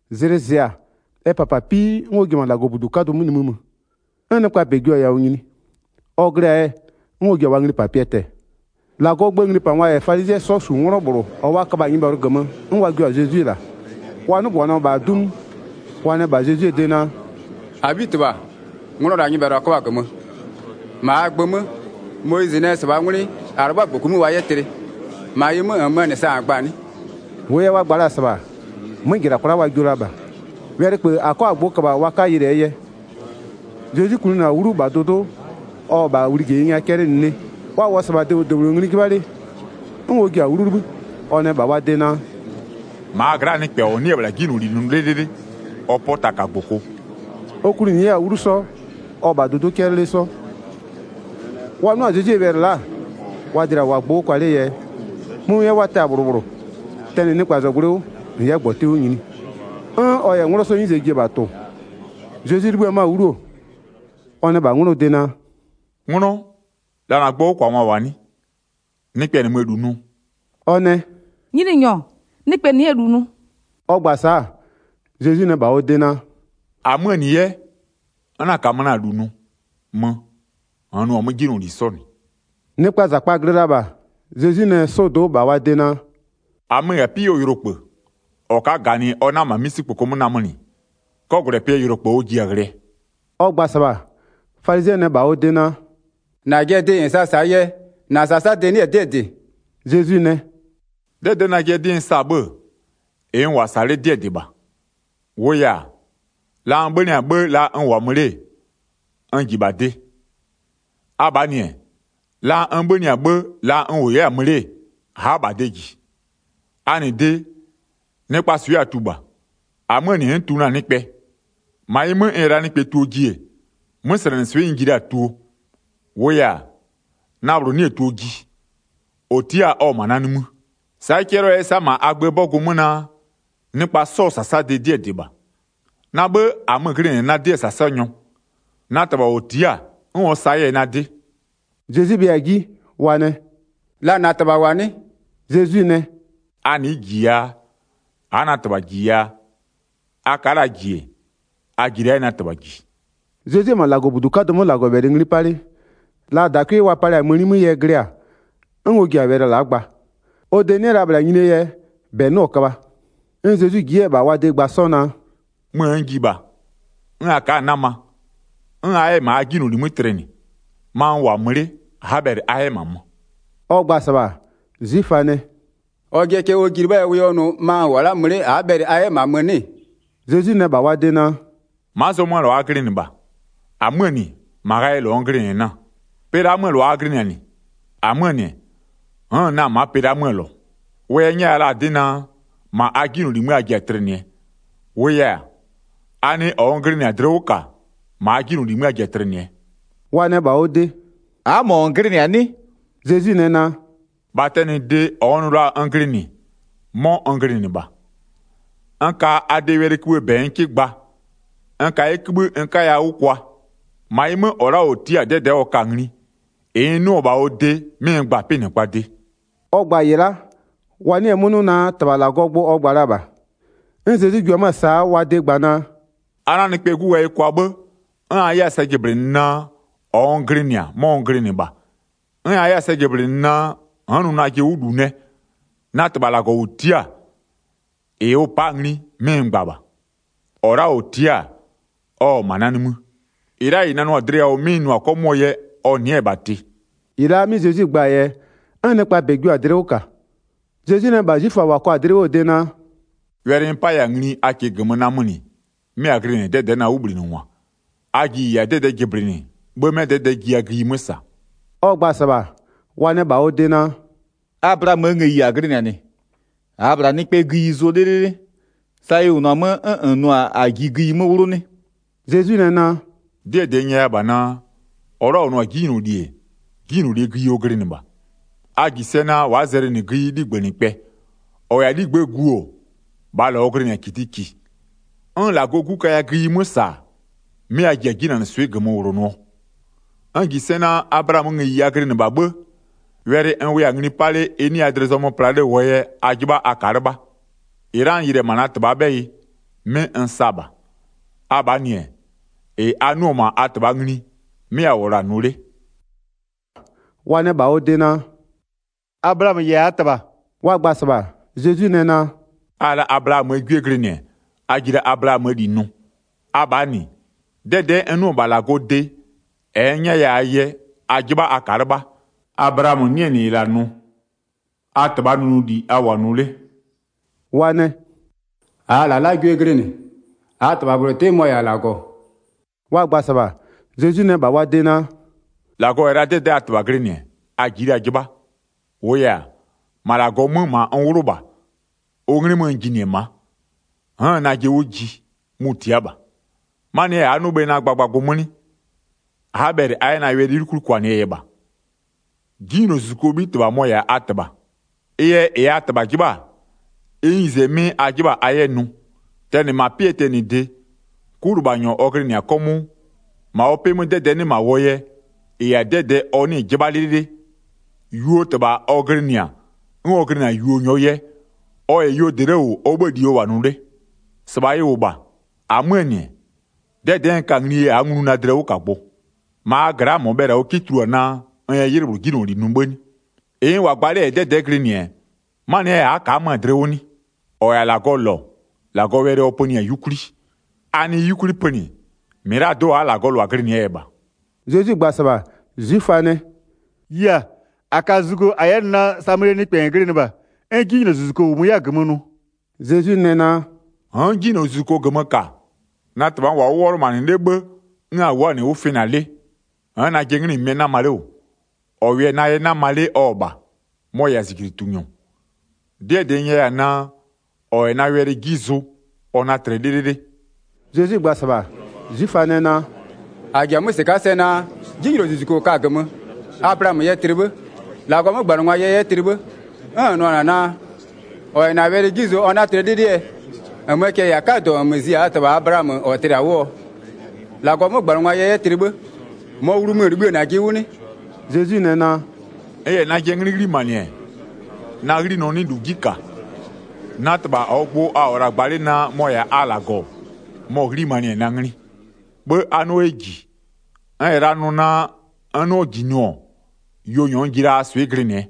Zlɩ zɩ-a, ɛ -papapii 'n ɔ ji-e -ma -Lagɔbudu 'kadʋ 'mö nimï mö, 'n nɩkpaa -bɛ jio-a yawʋ nyini. Ɔ glɩ-a yɛ 'n ɔ ji-a wa nglipapɩɛ tɛ-ɛ. 3-Lagɔɔ gböö nglipangwa -yɛ falizɩɛ 'sɔ -su 'nglɔ -bhlʋ -ɔ wa köbha-a nyɩbhɛlʋ -gömö, 'n wa jio-a Zezwi -la. Wa 'nɩgbanɩɔ-ɔ -bha 'du 'mö, wa nɛ -bha Zezwie de naa: “-Abhitɩbha, nglɔ la'a nyɩbhɛlʋ -a köbhɔ-a -gömö. 5-Ma -aa gbö 'mö, Moyizɩ nɛ -sɩbhaa 'ngwlɩ -a 'lɩbhʋa -gboku 'mö wa 'yɛ tlɩ. -Ma ɩ 'mö, -nmöö -nɩ sa -n gba-a -na 'nɩ?” 6-Wʋʋ yɛ wa gba la-a -sɩbha, 'mö -jɩla kwla'a wa jio la -bha, wɛlɩköbhë -a 'kɔ-a gbʋ köbha wa 'ka ghlɩɛ yɛ. Zezwi kwlinɩ-a 'wlu -bha dʋdʋ'ʋ, ɔ-ɔ la'a -bha wlijeyi nya 'cɛlɩnɩ 'le, wa -wʋɔ-a -sɩbha debhlʋ -debhlʋ ngli 'jɩbha 'le, 'n ɔ ji-a 'wlu 'libhï, ɔ nɛ -bha wa de naa: “-Ma a gla'aa nɩkpɛ -ɔ 'nɩ-ɛ -bhla 'jinyloli nʋ 'lɩlɩlɩ, ɔ 'pɔ taka -gboko.” Ɔ kwlinɩ 'yɛ-a 'wlu 'sɔ, ɔ-ɔ -bha dʋdʋ'ʋ 'cɛlɩ 'le 'sɔ. Wa 'nʋ-a Zezwie wɛlɩ la'a, wa dlɩa-a -wʋʋa-a gbʋ 'wʋ kwa 'lee yɛ, mömɩɛ wa tɛ-a -bhlʋ -bhlʋ, tɛnɩ nɩkpazɔgblʋɩ 'wʋ -n 'yɛ -gbɔtɩ 'wʋ nyini, 'n ɔ -yɛ 'nglɔ 'sɔɔ 'nyize ji-e -bha tʋ-ʋ. Zezwi 'libhï-ë 'mö-a 'wlu-o, ɔ nɛ -bha ɔ de naa: “'Nglɔ, la -na gbʋɔ 'wʋkwangwa -wʋ-a 'nɩ? Nɩkpɛ -nɩmö-ö -lu nʋ?” Ɔ nɛ: “Nyininyɔ, nɩkpɛ nɩ'ɩ-ɛ -lu nʋ.” Ɔ gba-a sa'a, Zezwi nɛ -bha ɔ de naa: “-Amöö -nɩ 'yɛ, n 'na -kamö na-a -lu nʋ. Mö, -nn nʋ-a 'mö 'jinyloli 'sɔ -nɩ.”] Nɩkpaa -zakpa-a glɩ la-a -bha, Zezwi nɛ 'sɔdo'o -bha wa de naa: “-Amö-ö -yɛ-a ma'a 'pɩ 'wʋɔ yʋlokpë. -Ɔ ka'a -ganɩ ɔ 'na -ma 'misikpoko 'mö namönɩ, 'kɔgwlɛpɩɛ yʋlokpë ɔ ji-a ghlɩɛ.” Ɔ gba-a -sɩbha, falizɩɛ nɛ -bha ɔ de naa: “-Najɩɛ dɩ -n sa-a -saa yɛ, -na -sasadɩ 'nɩ-ɛ 'dɩɛ -dɩ.” Zezwi nɛ: “'Dɛdɛ'ɛ, najɩɛ 'dɩ n sa-a 'bhë-ë, -ɩ n -wʋ-a -sa 'le 'dɩɛ -dɩ -bha. -Wʋʋ yɛ-a, la n 'bhönɩ-a 'bhë la n -wʋ-a mö 'le n -ji -bha de. Abhaa -nɩ-ɛ, la n 'bhönɩ-a 'bhë, la n -wʋ 'yɛ-a mö 'le, a'a -bha de -ji. A -nɩ de, nɩkpaa swɩ a tu -bha, -amöö -nɩ n'n tu na-a nɩkpɛ. 16-Ma ɩ 'mö, n -yɛ la na-a tuo ji-e, 'möslɛnɩswɩ'ɩ n ji la-a tuo, -wʋʋ yɛ-a, na -bhlʋ 'nɩ-ɛ tuo ji, -ɔ tia'a-a ɔ-ɔ -ma na nimï. Sa'a ɩ 'cɛlɩɔ 'yɛ-ɛ sa'a -ma a gböö 'bɔgʋ 'mö naa: Nɩkpa 'sɔɔ -sasadɩ 'dɩɛ -dɩ -bha. Na 'bhë -amö-ö glɩnɩ-ɛ najɩɛ 'dɩɛ -sasanyɔ, na -Tɩbha -ɔ tia'a-a 'n ɔ sa 'yɛ-a na 'dɩ.” Zezwi bhɩa-a 'ji, wa nɛ: “La -na -Tɩbha -wʋ-a 'nɩ?” Zezwi nɛ: “A nɩ'ɩ -ji yaa, a'a na -Tɩbha -ji yaa, a ka'a la -ji-e, a ji la 'yɛ na -Tɩbha -ji.” Zezwi-e -ma -Lagɔbudu 'kadʋ 'mö -Lagɔwɛlɩ ngli 'pa 'le, la -dakwɩ wa palɩ-a mëni 'mö yɛ glɩ-a, 'n ɔ ji-a wɛlɩ la'a gba. Ɔ de 'nɩ la -bhla nyinie yɛ, -bɛ 'nɩɔ-ɔ köbha. 'N Zezwi ji 'yɛ-ɛ -bha wa de gba 'sɔ naa: “Möö n ji -bha, 'n a ka'a-a 'nama, 'n a 'yɛ-ɛ -ma a 'jinyloli 'mö tlɩnɩ, ma n -wʋ-a mö 'le a'a bhɛlɩ a 'yɛ -ma mö.” Ɔ gba-a -sɩbha, 'zwiföa nɛ: “Ɔjɩɛ cɛ ɔ ji 'lɩbhaa yɛ ɔ nʋ: Ma n -wʋ-a mö 'le a'a bhɛlɩ a 'yɛ -ma mö 'nɩ?” Zezwi nɛ -bha wa de naa: “Ma'a zɔmöö -lʋa a glɩnɩ -bha. -Amöö -nɩ, -ma ghayɩɛ -lɔ n glɩnɩ-ɛ na-a. Pɩ la'aa 'möö -lʋa a glɩnɩ-a -nɩ. -Amöö -nɩ, n'n-n na-a ma'a pɩ la'aa 'möö -lɔ. Wʋ yɛ n 'nyɛya la-a 'dɩ naa: -Ma a 'jinyloli 'mö a ji-a tlɩnɩɛ. -Wʋʋ yɛ-a, a nɩ -ɔ n glɩnɩ-a dlɩ 'wʋ -ka, -ma a 'jinyloli 'mö a ji-a tlɩnɩɛ.” Wa nɛ -bha ɔ de: “A'a -mɔ -n glɩnɩ-a 'nɩ?” Zezwi nɛ naa: “-Bha tɛnɩde, -ɔ n nʋ la-a n glɩnɩ, 'mɔ n glɩnɩ -bha. N ka a de wɛlɩkïbhïë -bɛ n 'kɩ gba, n ka 'yɛ kïbhï -ɩ n 'kaya-a 'wʋ kwa. -Ma ɩ 'mö, -ɔ la'a -ɔ tia'a-a 'dɛdɛ'ɛ ɔ ka-a ngli, -ɩ n 'nʋ-ɔ -bha ɔ de 'mɩ n gba-a 'pɩnɩkpaa de.” Ɔ gba-a -ɩ la'a, wa 'nɩɩ-ɩ 'mö 'nʋ naa -Tɩbha -Lagɔɔ gbʋ ɔ gba la -bha. 'N Zezwi ji-e 'mö-ö sa'a wa de gba naa: “A 'na Nɩkpɛɛ 'Gu ghayɩ kwa 'bhë, 'n a 'yɛ-a sɛ jɩblɩnɩ naa -ɔ n glɩnɩ-a 'mɔ n glɩnɩ -bha, 'n a 'yɛ 'yɛ-a sɛ jɩblɩnɩ naa, n'n nʋ najɩ 'wʋ -lu nɛ, na -Tɩbha -Lagɔ -ʋ tia'a-a, -ɩ ʋ pa'a-a ngli 'mɩ n gba -bha. 29-Ɔ la'a -ɔ tia'a-a, ɔ-ɔ -ma na nimï, -ɩ la'a -ɩ nanɩɔ-a dlɩ yawʋ 'mɩ n nʋ-a 'kɔmʋʋɔ yɛ, ɔ nɩ'ɩ-ɛ -bha tɩ.” 30-Ɩ la'a 'mɩ Zezwi gba-aa yɛ, 'n nɩkpaa -bɛ jio-a dlɩ 'wʋ -ka. Zezwi nɛ -bha 'zwiföa -wa kɔ la-a dlɩ 'wʋɔ de naa: “Wɛlɩ n 'paya-a ngli a -kɩɩ -gömö namönɩ 'mɩ a glɩnɩ-a 'dɛdɛ'ɛ na 'wʋbhlinɩngwa. A ji -ɩ -yɛ-a 'dɛdɛ'ɛ jɩblɩnɩ, 'bhë 'mɛ 'dɛdɛ'ɛ jiya gïyi 'mö -sa.” Ɔ gba-a -sɩbha, wa nɛ -bha ɔ de naa: “Ablaamöö ngëyi -a glɩnɩ-a -nɩ, -aa-a -bhla nɩkpɛɛ gïyi zʋ 'lɩlɩlɩ. Sa ɩ -wʋnʋ-a 'mö 'n -n nʋ-a a ji gïyi 'mö 'wlʋ 'nɩ?” Zezwi nɛ naa: “'Dɩɛ -dɩ n nyɛya -bha naa: -Ɔ la'a -ɔ nʋ-a 'jinyloli-e, 'jinylolie gïyi ɔ glɩnɩ -bha. A -ji sɛ naa, wa'a zɛlɩnɩ gïyi 'ligbënɩkpɛ, -ɔ -yɛ-a 'ligbë'ëë gu-o, -bhaa -lɔ ɔ glɩnɩ-a -kitiki. 'N -Lagɔɔ 'Gu kaya gïyi 'mö -sa-a, 'mɩ a ji-a 'jinanɩswɩ'ɩ -gömö -wlonʋɔ. N -ji sɛ naa, Ablaamöö ngëyi a glɩnɩ -bha 'bhë, wɛlɩ n wʋya-a ngli 'pa 'le ɩ 'nɩya dlɩ zɔmö pla 'le -wʋɔ yɛ, a 'jɩbha a ka'a 'lɩbha. 38-Ɩ la'a -ɩ n yɩlɩ-ɛ -ma na -Tɩbhaa 'bhɛyɩ, 'mɩ n sa -bha. Abhaa -nɩ-ɛ, -ɩ a 'nʋ-ɔ -ma a -tɩbhaa ngli, 'mɩ a -wʋ-ɔ -la nʋ 'le.” Wa nɛ -bha ɔ de naa: “Ablaamö -yɛ-a -aa -tɩbha.” Wa gba-a -sɩbha, Zezwi nɛ naa: “A -yɛ la Ablaamöö 'gwie glɩnɩ-ɛ, a ji la Ablaamöö -li nʋ. Abhaa -nɩ, 'dɛdɛ'ɛ n 'nʋ-ɔ -bha -Lagɔɔ de, -ɛ n 'nyɛya-aa yɛ, a 'jɩbha a ka'a 'lɩbha. Ablaamö 'nɩ-ɛ -nɩ -ɩ -la nʋ. A -tɩbhaa nʋnʋli a -wʋ-a nʋ 'le.” Wa nɛ: “-Aa -lalagwie glɩnɩ, -aa -Tɩbha -bhlʋ 'tɩ, mɔ-ɔ -yɛ-a -Lagɔ.” Wa gba-a -sɩbha, Zezwi nɛ -bha wa de naa: “-Lagɔ -yɛ la 'dɛdɛ'ɛ a -Tɩbha glɩnɩ-ɛ, a ji'i la 'jɩbha. -Wʋʋ yɛ-a, -ma -Lagɔ 'mö -ma n 'wlʋ -bha, ʋ 'nglɩ 'mö n jinɩ-ɛ ma'a, n'n-n najɩ 'wʋ ji, mʋ-ʋ tia'a -bha. 'Manɩɛ yɛ a'a 'nʋ bhe na gbagbagbʋ 'mö 'nɩ? A'a bhɛlɩ a 'yɛ na wɛlɩ 'yukwli kwanɩɛ yɛ -bha. 'Jinylozuzukuo 'bhitɩbha mɔ-ɔ -yɛ-a a -tɩbha, ɩ yɛ -ɩ a -tɩbha 'jɩbha-a, ɩ 'nyize 'mɩ a 'jɩbha-a a 'yɛ nʋ. Tɛnɩ -ma 'pɩɛ tɛnɩde, 'kulɩbhanyɔ ɔ glɩnɩ-a 'kɔmʋʋ. -Ma ɔ 'pɩ 'mö 'dɛdɛ'ɛ 'nɩ -ma -wʋɔ yɛ, -ɩ -yɛ-a 'dɛdɛɛ ɔ 'nɩɩ-ɩ 'jɩbha 'lɩlɩlɩ. Yuoo -tɩbha ɔ glɩnɩ-a 'n ɔ glɩnɩ-a yuonyɔɔ yɛ, ɔ -yɛ yuo -dɩ 'le -wʋ ɔ 'bhëë -li ɔ -wʋ-a nʋ 'le. 45-Sɩbha ɩ -wʋ -bha. -Amöö -nɩ-ɛ, 'dɛdɛ'ɛ n ka na-a nglie yɛ a'a nglu na dlɩwʋkagbʋ. 46-Ma a gla'aa -mɔ bhɛlɩ-a ɔ 'kɩ tulua naa, n yɛ 'ylɩ -bhlʋ 'jinyloli nʋ 'bhë 'nɩ? -Ɩ n -wʋ-a gba 'le -yɛ 'dɛdɛ'ɛ glɩnɩ-ɛ, 'manɩɛ yɛ a'a ka'a 'mö-a dlɩ 'wʋ 'nɩ? 47-Ɔ -yɛ-a -Lagɔɔ -lɔ, -Lagɔɔ wɛlɩ ɔ pönɩ-a 'yukwli, a nɩɩ 'yukwli pönɩ, -mɩlado'o a'a -Lagɔɔ -lʋa glɩnɩ-ɛɛ yɛ -bha.” Zezwi gba-a -sɩbha, 'zwiföa nɛ: “Yia, -a ka zugo -a 'yɛ nʋ naa Samalie nɩkpɛ -n glɩnɩ -bha, 'n 'jinylozuzuko -wʋmö 'yɛ-a -gömö nʋ.” Zezwi nɛ naa: “N'n 'jinylozuzuko -gömö -ka, na -Tɩbha n -wʋ-a 'wʋ 'wɔlʋmanɩ 'le 'bhë, 'n a wʋ'ʋ-a -nɩ 'wʋ fɩna 'le. N'n najɩɛ 'nglɩmömɩɛ 'nama 'le -wʋ, -ɔ -wʋɩ-a na yɛ 'nama 'le ɔ-ɔ -bha, mɔ-ɔ -yɛ-a -zijlitunyɔ. 'Dɩɛ -dɩ n nyɛya-a naa: -Ɔ -yɛ na wɛlɩ 'ji zʋ, ɔ 'na tlɩ 'lɩlɩlɩ.” Zezwi gba-a -sɩbha, 'zwiföa nɛ naa: “-A -ji-a 'mö -sɩka'a sɛ naa, 'jinylozuzuko -n ka-a -gömö, Ablaamö yɛ tlɩ 'bhë, -Lagɔɔ 'mögbanɩngwa yɛ 'yɛ tlɩ 'bhë, 'n -n nʋ-ɔ -na naa: -Ɔ -yɛ -na wɛlɩ 'ji zʋ, ɔ 'na tlɩ 'lɩlɩɛ? 53-Nmöö cɛ-ɛ -yɛ-a 'kadɔ -nmö zi-a -aa -tɩbha Ablaamö -ɔ tlɩ-a 'wʋɔ? -Lagɔɔ 'mögbanɩngwa yɛ 'yɛ -nɩ tlɩ 'bhë, -mɔɔ wlumö -n libhï-ë -najɩ 'wʋ 'nɩ?” Zezwi nɛ naa: “N -yɛ najɩɛ 'nglɩ 'ghlimanɩ-ɛ, na 'ghlinɔ 'nɩ -lu 'ji -ka, na -Tɩbha -ɔɔ gbʋ a -wʋ-ɔ -la gba 'le naa mɔ-ɔ -yɛ-a a -Lagɔ, mɔ-ɔ 'ghlimanɩ-ɛ na 'nglɩ, 'bhë a 'nɩɔ 'yɛ -ji. N -yɛ la nʋ naa, n 'nɩɔ -ji nʋ-ɔ, yuonyɔ n ji la-a a swɩ glɩnɩɛ.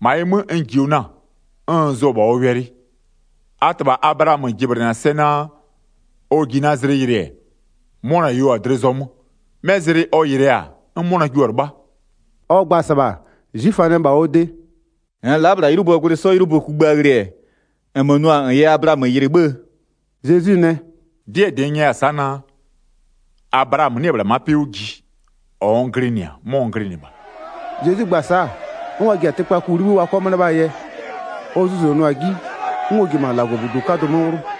-Ma ɩ 'mö, n -jio na-a, 'n n zʋ-ɔ -bha ɔ wɛlɩ. A -tɩbha Ablaamö jɩblɩnɩ-a sɛ naa, ɔ ji na zlɩ yɩlɩ-ɛ, 'mʋna yeo-a dlɩ zɔmö. 'Mɛ zlɩ ɔ yɩlɩɛ-a, 'n 'mʋna jio-a 'lɩbha.” Ɔ gba-a -sɩbha, 'zwiföa nɛ -bha ɔ de: “-Nn la'a -bhla 'ylʋböö gwlɩ 'sɔ 'ylʋbö kugbïa ghlɩ-ɛ, -nmö nʋ-a -n yɛ Ablaamö yɩlɩ 'bhëë?” Zezwi nɛ: “'Dɩɛ -dɩ n nyɛya-a sa'a naa: Ablaamö 'nɩ-ɛ -bhla ma'a 'pɩ 'wʋ ji-e, -ɔ n glɩnɩ-a 'mɔ n glɩnɩ -bha.” Zezwi gba-a sa'a, 'n wa ji-a tɩkpaku 'libhï wa 'kɔ 'mö 'lɩbhaa yɛ, ɔ zuzonʋa-a 'ji, 'n ɔ ji-e -ma -Lagɔbudu 'kadʋ 'mö 'wlʋ.